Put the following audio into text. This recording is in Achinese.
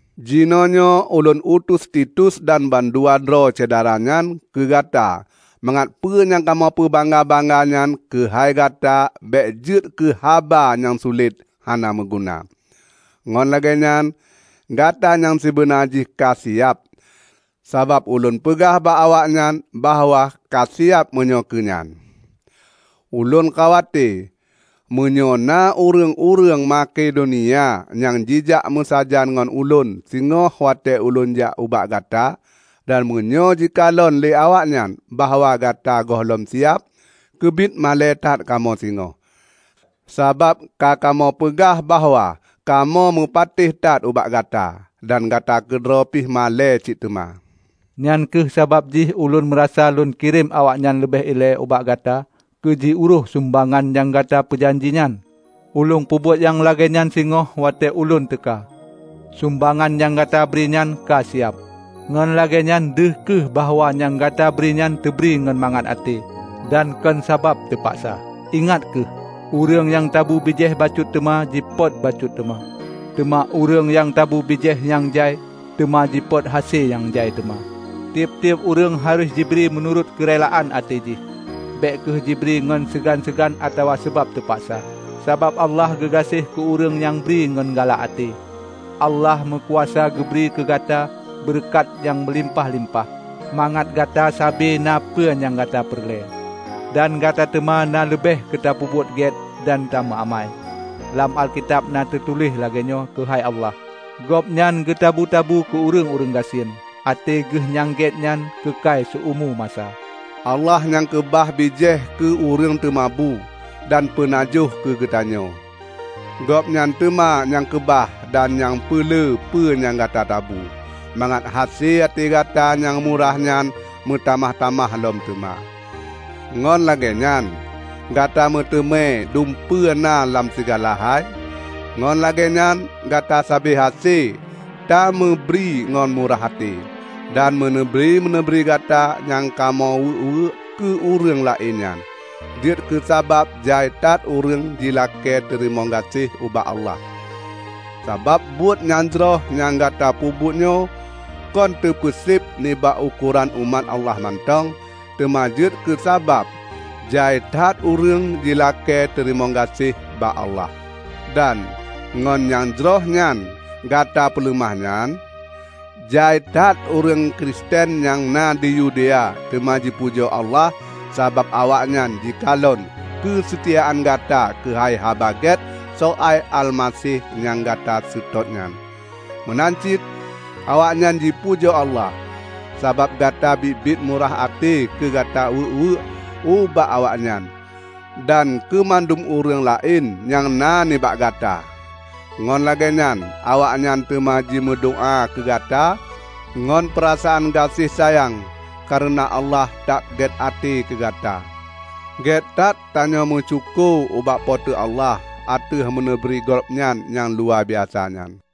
Jinoenyoe ulôn utus Titus dan bandua droe syedara nyan keu gata mangat peue nyang kamoe peubangga-bangga nyan keuhai gata bék jeuet keu haba nyang sulet hana meuguna. Ngon lagée nyan, gata nyang sibeuna jih ka siab, sabab ulôn peugah bak awaknyan bahwa ka siab meunyoe keu nyan. Ulôn khawate meunyoe na ureuëng-ureuëng Makedonia nyang jijak meusajan ngon ulôn singoh watée ulôn jak ubak gata. Dan meunyoe jikalon lé awaknyan bahwa gata gohlom siab, keubiet malée that kamoe singoh, sabab ka kamoe peugah bahwa kamoe meupatéh that ubak gata! Dan gata keudroe pi malée cit teuma. Nyang kheueh sabab jih ulôn meurasa lôn kirém awaknyan leubeh ilée ubak gata keu jiurôih sumbangan nyang ka gata peujanji nyan. Ulôn peubuet nyang lagée nyan singoh watée ulôn teuka, sumbangan nyang gata bri nyan ka siab. Ngon lagée nyan, deuh kheueh bahwa nyang gata bri nyan teubri ngon mangat até, dan kon sabab teupaksa. Ingat kheueh! Ureuëng nyang tabu bijéh bacut teuma jipot bacut teuma. Teuma ureuëng nyang tabu bijéh nyang jai teuma jipot hase nyang jai teuma. Tieb-tieb ureuëng harôh jibri meunurot keurelaan até jih. Bék kheueh jibri ngon seugan-seugan atawa sabab teupaksa, sabab Allah geugaséh keu ureuëng nyang mubri ngon galak até. Allah meukuasa geubri keu gata beureukat nyang meulimpah-limpah, mangat gata sabe na peue nyang gata peureulée; dan gata teuma na leubeh keu tapeubuet gét dan tameu amai. Lam Alkitab na teutuléh lagée nyoe keuhai Allah, "Gobnyan geutabu-tabu keu ureuëng-ureuëng gasien; até geuh nyang gét nyan keukai siumu masa." Allah nyang keubah bijéh keu ureuëng teumabu dan peunajoh keugeutanyoe. Gobnyan teuma nyang keubah dan nyang peulé peue nyang gata tabu, mangat hase até gata nyang murah nyan meutamah-tamah lom teuma. Ngon lagée nyan gata meuteumé dumpeue na lam sigala hai ngon lagée nyan gata sabe hase tameubri ngon murah até. Dan meuneubri-meuneubri gata nyang kamoe weuek-weuek keu ureuëng laén nyan, jeuet keusabab jai that ureuëng jilakée teurimong gaséh ubak Allah. Sabab buet nyang jroh nyang gata peubuet nyoe kon teupeuseb nibak ukoran umat Allah mantong, teuma jeuet keusabab jai that ureuëng jilakée teurimong gaséh bak Allah. Dan ngon nyang jroh nyang gata peuleumah nyan, jai that ureuëng Kristen nyang na di Yudea teuma jipujoe Allah sabab awaknyan jikalon keuseutiaan gata keuhai Haba Gét soai Almaseh nyang gata seutôt nyan. Meunan cit, awaknyan jipujoe Allah, sabab gata biet-biet murah até keu gata weuek-weuek ubak awaknyan dan keu mandum ureuëng laén nyang na nibak gata. Ngon lagée nyan awaknyan teuma jimeudoá keu gata ngon peurasaan gaséh sayang kareuna Allah that gét até keu gata. Gét that tanyoe meusyukoe ubak Po teu Allah ateueh meuneubri Gobnyan nyang luwabiasa nyan.